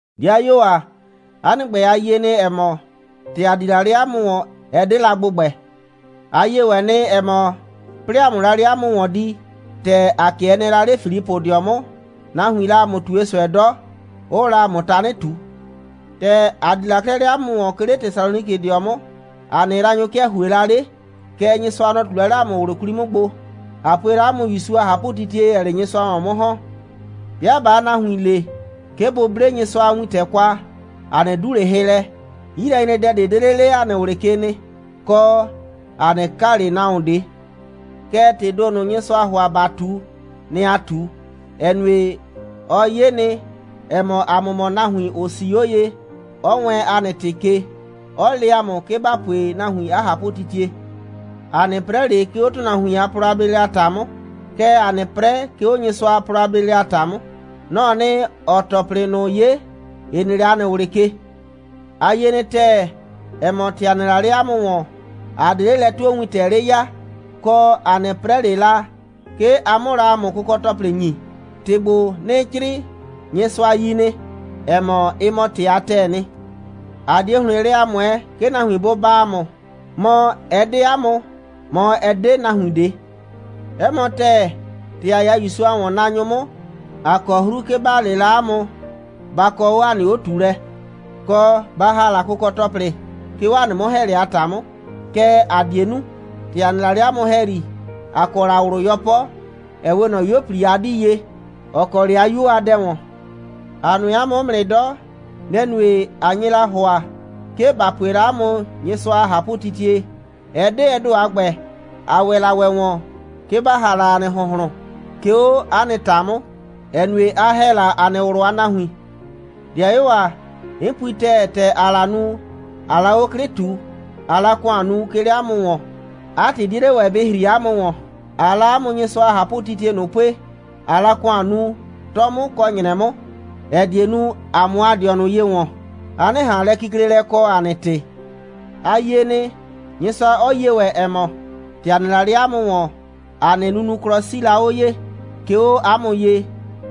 'Dɩayuo ‑a, 'a nɩ ‑gbɛ, a yie nɩ, ‑ɛ mɔ, ‑tɛ ‑a di la 'le 'a mʋ ‑wɔn, ɛ 'de la ‑gbʋgbɛ. A yie ‑wɛ nɩ, ‑ɛ mɔ, 'plɩɩ ‑a 'mʋ la 'le 'a mʋ ‑wɔn di, ‑tɛ ‑a 'kɩɛ nɩɛ la 'le Filipʋdɩɔ 'mʋ, nahuiin la ‑a mʋ ꞊tue ꞊sʋɛ 'dɔ, 'ʋʋ la ‑a mʋ tanɩ ꞊tu. ‑Tɛ ‑a di la 'klɛɛ 'le 'a mʋ ‑wɔn, 'ke 'le Tesalonikɩdɩɔ 'mʋ, ‑a nɩ yraanyʋ 'kɩɛ ‑hue la 'le. Kɛɛ, Nyɩsʋa, nɔ‑ ꞊tu la 'le ‑a mʋ ꞊wlʋ 'kwli 'mʋ gbo, ꞊a pue la 'a mʋ ‑Yusu a ꞊hapʋtitie, ‑ɛɛ 'le Nyɩsʋa ‑wɔn 'mʋ ‑hɔn. 'Bɩa ꞊baa nahuin le, 'ke bʋ 'ble Nyɩsʋa a wintɛ kwa, ‑a 'nɩ 'du ꞊le hɩ lɛ, 'yilɛnyredɛ ꞊de 'de 'le 'le ‑a nɩ ꞊wlɩ ke nɩ, kɔ, ‑a 'nɩ kaa ꞊le nahuon ꞊de. Kɛɛ, ‑tɩɩ ‑do ꞊nʋ, Nyɩsʋaa ‑hʋa, ‑ba ꞊tu, nɩ‑ ‑aa ꞊tu, ‑ɛ nue, ɔ 'ye nɩ, ‑ɛ mɔ, ‑a mʋ mɔ nahuin, ‑ʋ 'sii 'o ye, 'ɔ wɛɛn ‑a nɩ ‑tɩ ke, 'ɔ le ‑a mʋ, 'ke ‑ba pue nahuin 'a ꞊hapʋtitie. ‑A 'nɩ 'prɛ ꞊le, 'ke 'o ‑tʋnahuin a plɔ a bleelɛ a ‑ta 'mʋ, kɛɛ, ‑aa 'nɩ 'prɛ, 'ke 'o Nyɩsʋa a plɔ a bleelɛ a ‑ta 'mʋ. Nɔ‑ɔ nɩ, ‑ɔɔ ‑tɔplɩ ꞊nʋ 'ye, ‑ɩ nɩ 'le ‑a nɩ ꞊wlɩ ke. A yie nɩ ‑tɛɛ, ‑ɛ mɔ, ‑tɛ ‑a nɩ la 'le 'a mʋ ‑wɔn, ‑a 'de 'le lɛ'tuowintɛ 'le ya, kɔ, ‑a 'nɩ 'prɛ ꞊le la, 'ke a 'mʋ la ‑a mʋ kʋkɔ‑tɔplɩ ‑nyi. ‑Tɩ ‑gbo, 'nɩɩ 'crɩɩ, Nyɩsʋa yi nɩ, ‑ɛ mɔ, ɩ mɔ ‑tɩ a ‑tɛɛ nɩ. ‑A 'die ‑hlɩn lɛ a ꞊mʋɛɛ, 'ke nahuin bʋ baa ‑a mʋ, mɔ, ɛ 'de 'a mʋ, mɔ, ɛ 'de nahuin ꞊de. 'Ɛ mɔ ‑tɛɛ, ‑tɛ ‑a 'ya ‑Yusu a ‑wɔnnaanyʋ 'mʋ, ‑a kɔ 'hru, 'ke ‑ba le la 'a mʋ, ba kɔ 'o ‑a nɩ 'o꞊tuulɛ, kɔ, ba ‑ha la kʋkɔ‑tɔplɩ, 'ke 'o ‑a nɩ 'mʋ‑hɛɛlɛ a ‑ta 'mʋ. Kɛɛ, ‑a 'die nu. ‑Tɛ ‑a nɩ la 'le 'a mʋ ‑hɛyri, ‑a kɔ la ꞊wlʋ 'yɔpɔ, ‑ɛ 'we ꞊nɔ 'yuo꞊pli a 'dii ye, ‑ɔ kɔ 'le 'a 'yuo a dɛ ‑wɔn. ‑A nʋɛ 'a mʋ 'mʋ nɩ 'dɔ. Nɛ‑ nue, ꞊a nye la ‑hʋa, 'ke ‑ba pue la 'a mʋ Nyɩsʋa a ꞊hapʋtitie. Ɛ 'de ɛ ‑do a ‑gbɛ. ‑A ‑wɛ la ‑wɛ ‑wɔn, 'ke ‑ba ‑ha la ‑a nɩ ‑hʋnhlʋn, 'ke 'o 'a nɩ ‑ta 'mʋ, ‑ɛ nue, a ‑hɛ la ‑a nɩ ꞊wlʋ a nahuin. 'Dɩayuo ‑a, 'n pui ‑tɛɛ, ‑tɛ ‑aa la nu, ꞊aa la 'o 'klɩ ꞊tu, ꞊aa la ‑kʋan nu, 'ke 'le 'a mʋ ‑wɔn, 'a ‑tɩ 'die 'le ‑wɛ bɩ ‑hri 'a mʋ ‑wɔn. ‑Aa la 'a mʋ Nyɩsʋa a ꞊hapʋtitie ꞊nʋ a pue, ꞊aa la ‑kʋan nu, 'tɔ 'mʋ kɔ ‑nyrɛ 'mʋ, ‑ɛ die nu, ‑a 'mʋ ‑a dɩɔnʋ ye ‑wɔn, a 'nɩ ꞊han lɛkiklelɛ kɔ, ‑a nɩ ‑tɩ. A yie nɩ, Nyɩsʋa 'ɔ yie ‑wɛ, ‑ɛ mɔ, ‑tɛ ‑a nɩ la 'le 'a mʋ ‑wɔn, ‑a nɩ nunuklɔ 'sii la 'o ye, 'ke 'o 'a mʋ ye,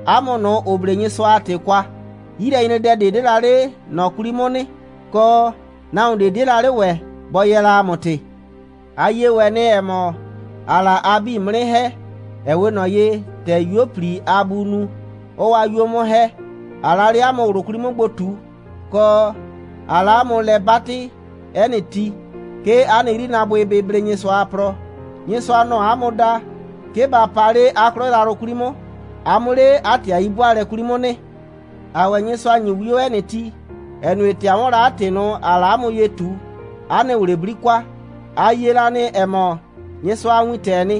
'a mʋ ꞊nʋ, ‑ʋ 'ble Nyɩsʋa a ‑tɩ kwa. 'Yilɛnyredɛ ꞊de 'de la 'le ꞊nɔ 'kwli 'mʋ nɩ, kɔ, nahuon ꞊de 'die la 'le ‑wɛ bɔ yɛɛ la ‑a mʋ ‑tɩ. A yie ‑wɛ nɩ, ‑ɛ mɔ, ‑aa la a 'bii 'mʋ 'nɩ ‑hɛ, ‑ɛ 'we ꞊nɔ ye, ‑tɛ 'yuo꞊pli a buu nu, 'ɔɔ 'a 'yuo 'mʋ ‑hɛ, ꞊aa la 'le 'a mʋ ꞊wlʋ 'kwli 'mʋ gbo ꞊tu, kɔ, ꞊aa la 'a mʋ lɛ 'batɩ 'ɛ nɩ ti, 'ke 'a nɩ 'yrinaabʋɩ bɩ blee Nyɩsʋa a plɔ. Nyɩsʋa, nɔ‑ɔ 'a mʋ da, 'ke ba pa 'le 'a 'klɔ yrayrʋ 'kwli 'mʋ, a 'mʋ 'le 'a ‑tɩ a 'yi'bʋaalɛ 'kwli 'mʋ nɩ. ‑Aa ‑wɛ Nyɩsʋa ‑nyi 'wio 'ɛ nɩ ti, ‑ɛ nue, ‑tɛ a 'wɔn la 'a ‑tɩ ꞊nʋ, ‑aa la 'a mʋ ye ꞊tu, 'a nɩ ꞊wlɩ 'bli kwa. A yie la nɩ, ‑ɛ mɔ, Nyɩsʋa a wintɛɛ nɩ,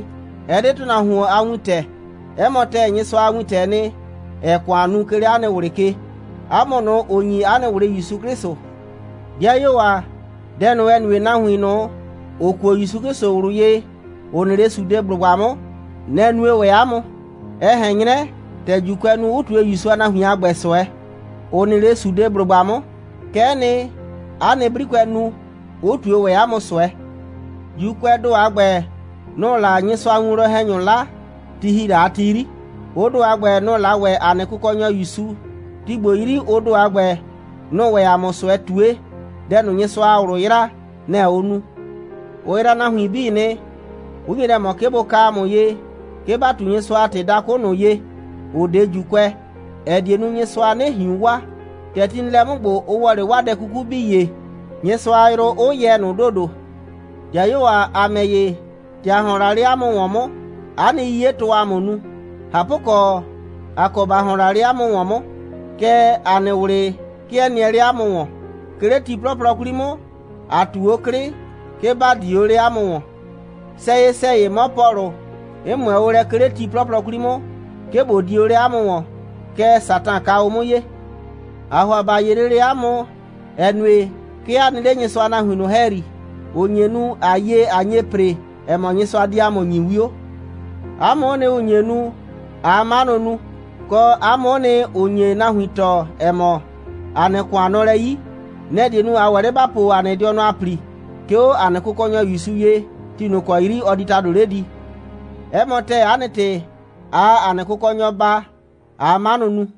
ɛ 'de ‑tʋnahuon a wintɛ. 'Ɛ mɔ ‑tɛɛ, Nyɩsʋa a wintɛɛ nɩ, ‑ɛɛ ‑kʋan nu, 'ke 'le 'a nɩ ꞊wlɩ ke, 'a mʋ ꞊nʋ, ‑ʋ ‑nyi 'a nɩ ꞊wlɩ ‑Yusu 'Klɩsʋ. 'Dɩayuo ‑a, dɛ ꞊nʋ, ‑ɛ nue nahuin ꞊nʋ, ‑ʋ kuo ‑Yusu 'Klɩsʋ ꞊wlʋ ye, ‑ʋ nɩ 'le Sudeblʋgba 'mʋ, nɛ‑ nue ‑wɛ 'a mʋ. Ɛ ꞊hɛn 'nyrɛ, ‑tɛ ‑Juukʋɛ nu, 'ʋ ꞊tue ‑Yusu a nahuin a ‑gbɛ ꞊sʋɛ, ‑ʋ nɩ 'le Sudeblʋgba 'mʋ, kɛ'ɛ nɩ, 'a nɩ 'brikʋɛ nu, 'ʋ ꞊tue ‑wɛ 'a mʋ ꞊sʋɛ. ‑Juukʋɛɛ ‑do a ‑gbɛ, nʋ‑ʋ la Nyɩsʋa a winwlɔn‑hɛnyʋ 'la, ti ‑hi la a ti 'yri, ʋ ‑do a ‑gbɛ, nʋ‑ 'la ‑wɛ ‑a nɩ Kʋkɔnyɔ ‑Yusu, ti ‑gbo 'yri, ʋ ‑do a ‑gbɛ, nʋ‑ʋ ‑wɛ ‑a mʋ ꞊sʋɛ ꞊tue. Dɛ ꞊nʋ, Nyɩsʋa a ꞊wlʋ yraa, nɛ‑ ʋʋ nu. Ʋ yraa nahuin 'bii nɩ, 'ʋ nye lɛ ꞊mɔ, 'ke bʋ ka ‑a mʋ ye, 'ke ‑ba ꞊tu Nyɩsʋa a ‑tɩ dakʋ ꞊nʋ ye, ‑ʋ 'de ‑Juukʋɛ, ‑ɛ die nu, Nyɩsʋa 'nɩ ꞊hiun waa. ‑Tɛ ti nɩ lɛ 'mʋ ‑gbo, ʋ ‑wɔ 'le 'waa dɛ 'kuku 'bii ye, Nyɩsʋa a yrʋ 'ʋ yɛ ꞊nʋ ‑dodo. 'Dɩayuo ‑a, ‑a ‑mɛ ‑ye, ‑tɛ ‑a ‑hɔn la 'le 'a mʋ ‑wɔn 'mʋ, 'a nɩ 'yiyetʋʋ ‑a mʋ nu. ꞊Hapʋkɔ, ꞊a kɔ ‑ba ‑hɔn la 'le 'a mʋ ‑wɔn 'mʋ, kɛɛ, ‑a nɩ ꞊wlɩ 'kɩɛ nɩɛ 'le 'a mʋ ‑wɔn. 'Ke 'le ti 'plɔplɔ 'kwli 'mʋ, ‑a ꞊tu 'o 'klɩ, 'ke ‑ba di o 'le 'a mʋ ‑wɔn. Sɛyɩ‑sɛyɩ 'mɔ Pɔlʋ, 'n ꞊mʋɛ o lɛ, 'ke 'le ti 'plɔplɔ 'kwli 'mʋ, 'ke ꞊bo di o 'le 'a mʋ ‑wɔn, kɛɛ, Satan ka o 'mʋ ye. ‑Aa ‑hʋa ‑ba 'ye lele 'a mʋ, ‑ɛ nue, 'ke a nɩ 'le Nyɩsʋa a nahuin ꞊nʋ ‑hɛyri, ‑ʋ nye nu, ꞊a yie, ꞊a nye ‑pre, ‑ɛ mɔ, Nyɩsʋa di ‑a mʋ ‑nyi 'wio. 'A mʋ'ʋ nɩ, ‑ʋ nye nu, ꞊aa 'manʋ nu, kɔ, 'a mʋ'ʋ nɩ, ‑ʋ nye nahuin tɔɔ, ‑ɛ mɔ, ‑a nɩ ‑kʋan nɔ lɛ 'yi. Nɛ‑ die nu, ꞊a ‑wɛ 'le ‑ba po ‑a dɩɔnʋ a ‑pli, 'ke 'o ‑a nɩ Kʋkɔnyɔ ‑Yusu ye, ti ꞊nʋ ‑kɔ 'yri ɔ di ‑tado 'le di. 'Ɛ mɔ ‑tɛɛ, 'a nɩ ‑tɩ, ꞊aa ‑a nɩ Kʋkɔnyɔ baa, ꞊aa 'manʋ nu.